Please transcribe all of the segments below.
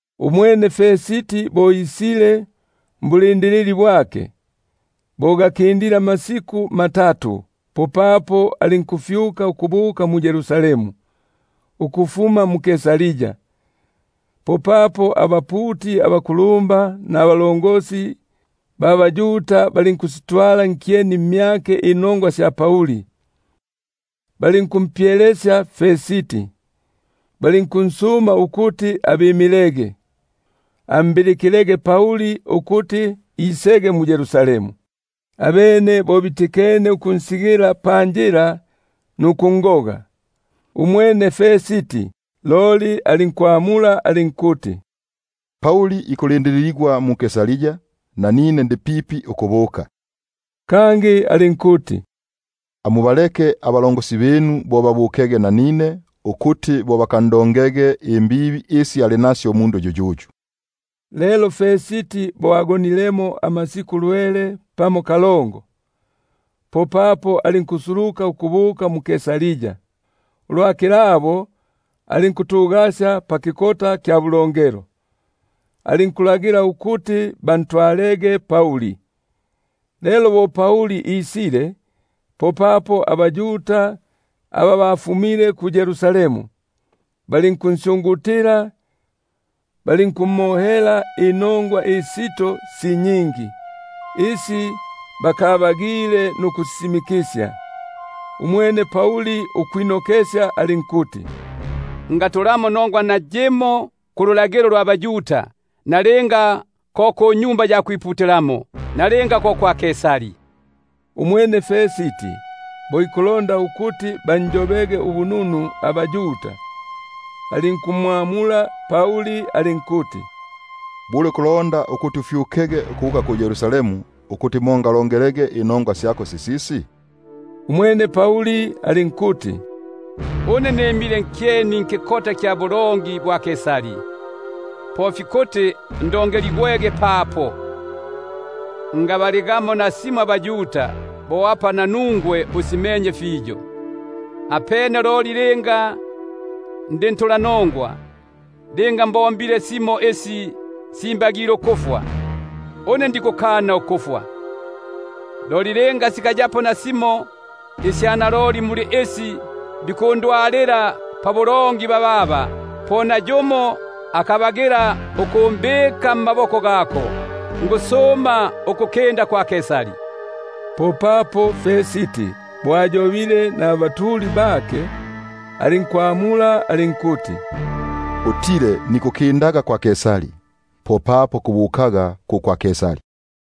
Umwene Festi bo ingile mbulindilili bwake, bo gakindile amasiku matatu, popapo alinkufyuka mu- Yerusalemu ukufuma mu-Kaisaria. Popapo abaputi abakulumba nabakulumba mbaYuda balinkusitwala nkyeni mmyake inongwa sya Pauli, balinkumpyelesya, balinkunsuma ukuti abimilege, ambilikilege Pauli ukuti isege mu-Yerusalemu; abene bo bitikene ukunsigila panjila nukungoga. Umwene Festi loli alinkwamula alinkuti: Pauli ikulindililigwa mu- Kaisaria, nanine ndi pipi ukubuka. Kangi alinkuti: Lelo aba bapegigwe amaka mmyinu, bo basulukege nanine, ukuti bakandongege imbibi isi ali nasyo umundu yuyuyu. Lelo bo agonilemo amasiku aga gakakindilepo lwele pamo kalongo, popapo alinkusuluka ukubuka mu-Kaisaria. Ulwa kilabo, alinkutugasya pakikota kya bulongelo, alinkulagila ukuti bantwalege Pauli. Lelo bo isile, popapo abaYuda aba bafumile mu-Yerusalemu balinkunsyungutila, balinkumohela inongwa isito si nyingi, isi bakabagile nukusisisimikisya. Umwene Pauli alinkwilongela ilya kuti: Ngatulamo inongwa nayimo kululagilo lwa baYuda, nalinga ko kwa Tempeli, nalinga ko kwa Kaisari. Umwene Festi bo ikuti banjobege ubununu abaYuda, alinkumwamula Pauli alinkuti: Bule kulonda ukuti ufyukege mu-Yerusalemu, ukuti mo ngalonge- lege inongwa syako sisisi? Umwene Pauli alinkuti: Une nimile nkyeni nkikota kya bulongi bwa Kaisari, po fikuti ndongeligwege papo. Ngabaligamo nasimo abaYuda, bo apa nanungwe usimenye fiyo. Apene loli linga ndi ntulanongwa, linga mbombile simo isi simbagile ukufwa, une ndikukana ukufwa; loli linga sikayamo nasimo muli isi bikundonga bababa, po nayumo akabagila ukumbika mmaboko gabo; nikusuma ukukinda kwa Kaisari. Popapo Festi bo ayobene naba lukomano, alinkwamula alinkuti: Utile nikukindaga kwa Kaisari, popapo kubukaga ku kwa Kaisari.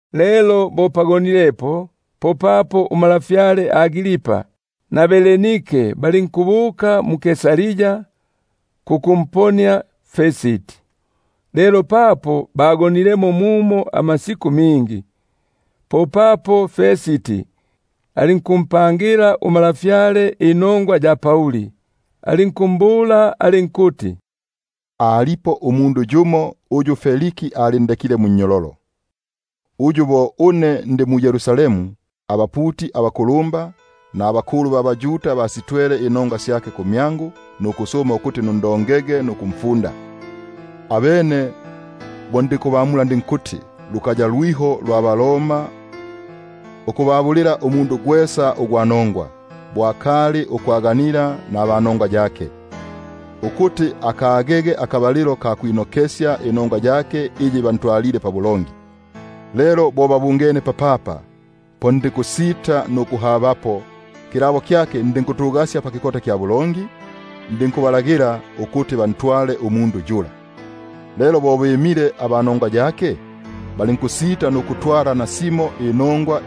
Lelo bo pagonilepo, po untwa Agripa pamopene na Bernike balinkubuka mu-Kaisaria kukumponia Festi. Lelo papo bagonilemo mumo amasiku mingi, popapo Festi alinkumpangila untwa inongwa sya Pauli, alinkumbula alinkuti: Alipo umundu yumo uyu Feliki alindekile munnyololo, uyu bo ndi mu-Yerusalemu, abaputi abakulumba nabakulu ba baYuda basitwele inongwa syake, ukuti alongigwege nukufundigwa. Abene bo ndinkubamula ndinkuti: Lukaya lwiho abaRoma ukubabulila umundu gwesa ugwa nongwa, bo akali ukwaganila naba nongwa yake, ukuti apage pabwinokesyo munongwa yake. Lelo bo babungene papapa, po ndinkusita nukuhabapo; ulwa kilabo ndinkutugasya pakikota kya bulongi, ndinkulagila ukuti bantwale umundu yula. Lelo bo bimile aba nongwa yake, balinkusita nukutwala nasimo inongwa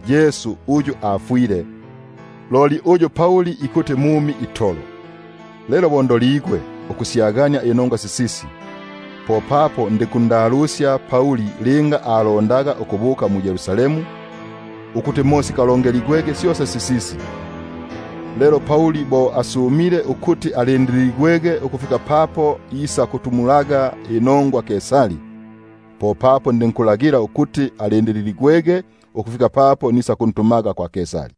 Yesu uyu afwile, uyu Pauli ikuti mumi itolo. Lelo bo ndoligwe ukusyagania inongwa sisisi, popapo ndinkundalusya linga alondaga ukubuka mu-Yerusalemu, ukuti mo sikalonge- ligwege syosa sisisi. Loli Pauli bo asumile ukuti alindililigwege ukufika papo isakutumulaga inongwa Kaisari, popapo ndinkulagila ukuti alindililigwege ukufika papo nisakuntumaga kwa Kaisari.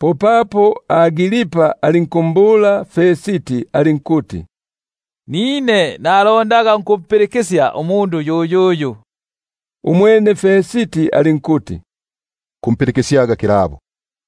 Popapo Agripa alinkumbula Festi alinkuti: Nanine nalondaga ukumpilikisya umundu yuyuyu. Umwene alinkuti: Kumpilikisyaga kilabo.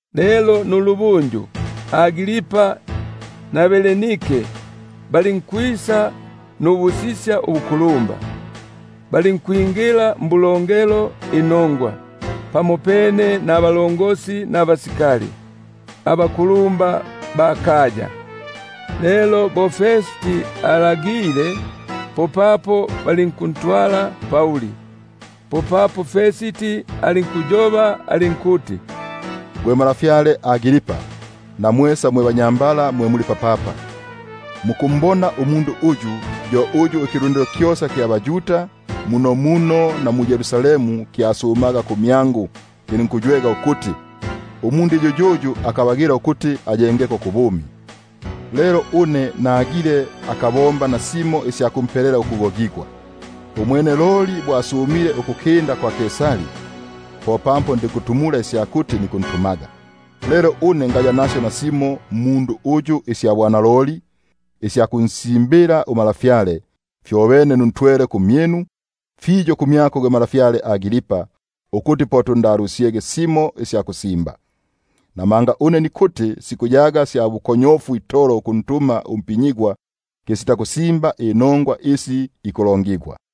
Lelo nulubunju, Agripa na Bernike balinkwisa nubusisya ubukulumba, balinkwingila mbulongelo inongwa, pamopene nabalongosi ba basikali, nabakulumba ba kaya. Lelo bo Festi alagile, popapo balinkuntwala Pauli. Popapo Festi alinkuyoba alinkuti: Gwe ntwa Agripa, na mwesa mwe banyambala mwe muli nanuswe papapa, mukumbona umundu uyu, yo uyu ikilundilo kyosa kya baYuda kyasumaga kumyangu mu-Yerusalemu na munomuno, kilinkuywega ukuti: Umundu yuyuyu akabagila ukuti ayengeko kubumi. Loli une nagile akabombamo nasimo isya kumpelela ukugogigwa; umwene loli bo asumile ukukinda kwa Kaisari, popapo ndinkusitumula ukuti nikuntumaga. Lelo une ngaya nasyo nasimo mmundu uyu isya bwanaloli, isya kunsimbila untwa; fyobene nuntwele kumyinu, fiyo kumyako gwe ntwa Agripa, ukuti bo tunda- lusisye, nsyage simo isya kusimba. Namanga une nikuti sikuyaga sya bukonyofu itolo ukuntuma umpinyigwa, kisita kusimba inongwa isi ikulongigwa.